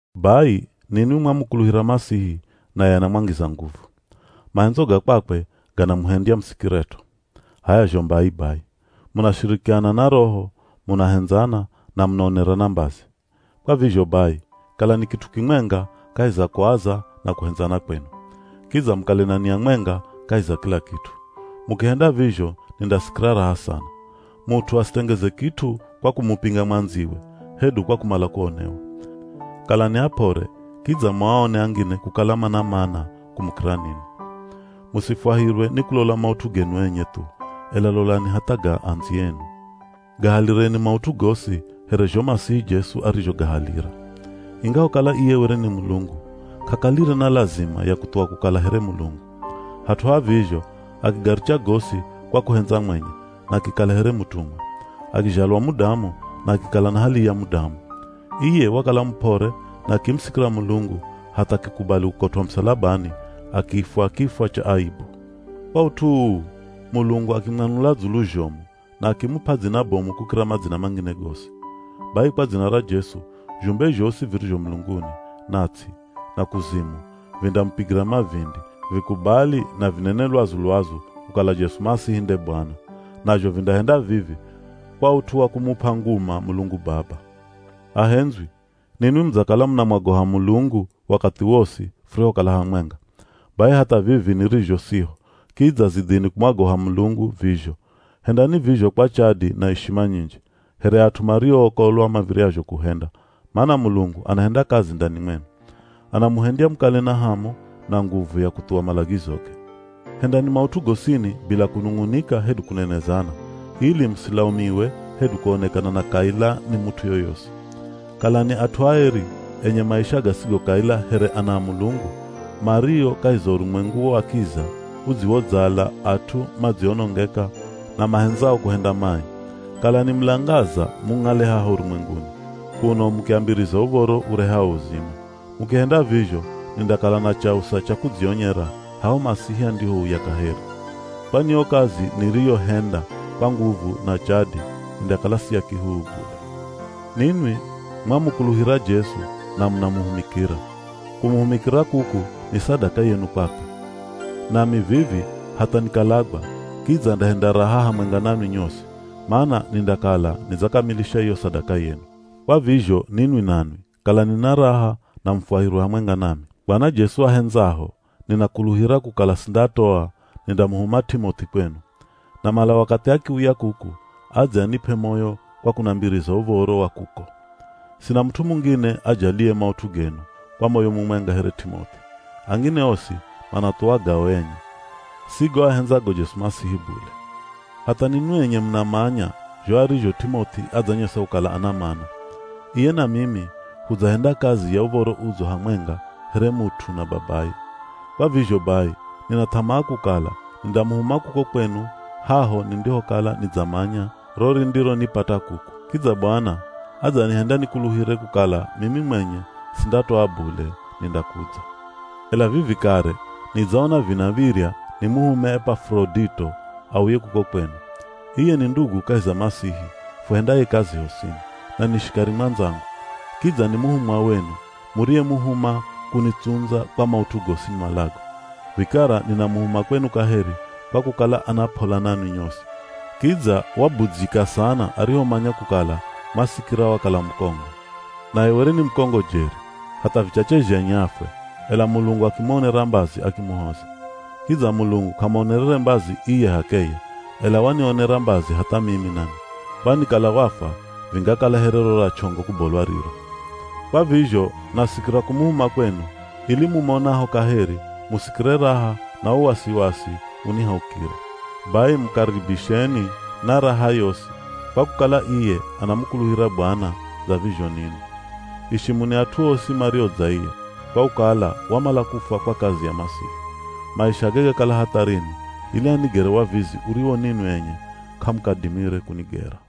Bai ninwi mwamukuluhira Masihi naye anamwangiza nguvu. Mahendzo ga kwakwe ganamuhendya musikiret'o. H'aya zho mbai bai, munashirikiana na Roho, munahendzana, na munaonerana mbazi. Kwa vizho bai, kalani kit'u kimwenga kahi za kuaza na kuhendzana kwenu. Kidza mukale na nia mwenga kahi za kila kit'u. Mukihenda vizho nindasikira raha sana. Mut'u asitengeze kit'u kwa kumupinga mwandziwe, hedu kwa kumala kuonewa. Kalani ap'ore kidza muaone angine kukala mana mana kumukira ninwi. Musifwahirwe ni kulola maut'u genu enye thu, ela lolani hatha ga andziyenu. Gahalireni maut'u gosi here zho Masihi Jesu arizhogahalira. Ingahokala iye were ni Mulungu, k'akalire na lazima ya kuthuwa kukala here Mulungu. Hat'u ha vizho, akigaricha gosi kwa kuhendza mwenye na akikala here mutumwa. Akizhalwa mudamu na akikala na hali ya mudamu. Iye wakala mup'ore na akimusikira Mulungu hatha akikubali kukotw'a musalabani akifwa kifwa cha aibu. Kwa ut'u uu, Mulungu akimwanula dzulu zhomu na akimup'a dzina bomu kukira madzina mangine gosi. Bai kwa dzina ra Jesu, zhumbe zhosi virizho mulunguni, na ts'i, na kuzimu vindamupigira mavindi, vikubali na vinene lwazu-lwazu kukala Jesu Masihi nde Bwana. Nazho vindahenda vivi kwa ut'u wa kumup'a nguma Mulungu Baba. Ahendzwi, ninwi mudzakala munamwogoha Mulungu wakathi wosi furihokala hamwenga. Bai hatha vivi nirizho siho, kidza zidhini kumwagoha Mulungu vizho. Hendani vizho kwa chadi na ishima nyinji, here at'u mariookolwa mav̱iryazho kuhenda, mana Mulungu anahenda kazi ndani mwenu. Anamuhendya mukale na hamu, na nguvu ya kuthuwa malagizoge. Hendani maut'u gosini bila kunung'unika hedu kunenezana, ili musilaumiwe hedu kuonekana na kaila ni mut'u yoyosi. Kalani at'u aeri, enye maisha gasigo kaila here ana a Mulungu, mario kahi za urumwengu wa kiza udziwodzala at'u madzionongeka na mahendzao kuhenda mai. Kalani mulangaza mung'ale haha urumwenguni, kuno mukiambiriza uv̱oro urehao uzima. Mukihenda vizho, nindakala na chausa cha kudzionyera haho Masihi andihouya kaheri. Kwani yo kazi niriyohenda kwa nguvu na chadi indakala si ya kihuhu bule. Ninwi mwamukuluhira Jesu na munamuhumikira. Kumuhumikira kuku ni sadaka yenu kwakwe. Nami vivi hatha nikalagwa kidza ndahenda raha hamwenga nanwi nyosi, mana nindakala nidzakamilisha iyo sadaka yenu. Kwa vizho ninwi nanwi kalani na raha na mufwahirwe hamwenga nami. Bwana Jesu ahendzaho, ninakuluhira kukala sindatoa nindamuhuma T'imoth'i kwenu. Namala wakathi akiuya kuku adze anip'e moyo kwa kunambiriza uv̱oro wa kuko. Sina mut'u mungine ajaliye maut'u genu kwa moyo mumwenga here T'imoth'i. Angine osi manathuwa gao enye, si go ahendzago Jesu Masihi bule. Hatha ninwi enye munamanya zho arizho T'imoth'i adzanyesa kukala ana mana. Iye na mimi hudzahenda kazi ya Uv̱oro Udzo hamwenga here mut'u na babaye. Kwa vizho bai, nina th'amaa kukala nindamuhuma kuko kwenu haho nindihokala nidzamanya ro rindironipata kuku. Kidza Bwana adzanihenda nikuluhire kukala mimi mwenye sindatoa bule nindakudza. Ela vivi kare nidzaona vinav̱irya nimuhume Epafurodito auye kuko kwenu. Iye ni ndugu kahi za Masihi fuhendaye kazi hosini, na ni shikari mwandzangu. Kidza ni muhumwa wenu, muriyemuhuma kunitsundza kwa maut'u gosi nimalago. Vikara ninamuhuma kwenu kaheri kwa kukala ana p'ola nanwi nyosi, kidza wabudzyika sana arihomanya kukala mwasikira wakala mukongo. Naye were ni mukongo jeri, hatha vichache zhenye afwe, ela Mulungu akimuonera mbazi akimuhoza. Kidza Mulungu k'amuonerere mbazi iye h'akeye, ela wanionera mbazi hatha mimi nami, kwani kala wafwa vingakala here ro ra ch'ongo kubolwa riro. Kwa vizho nasikira kumuhuma kwenu, ili mumonaho kaheri, musikire raha na wo wasiwasi unihaukire. Bai mukaribisheni na raha yosi, kwa kukala iye anamukuluhira Bwana dza vizho ninwi. Ishimuni at'u osi mario dza iye, kwa kukala wamala kufwa kwa kazi ya Masihi. Maishage gakala hatharini ili anigere wavizi uriwo ninwi enye k'amukadimire kunigera.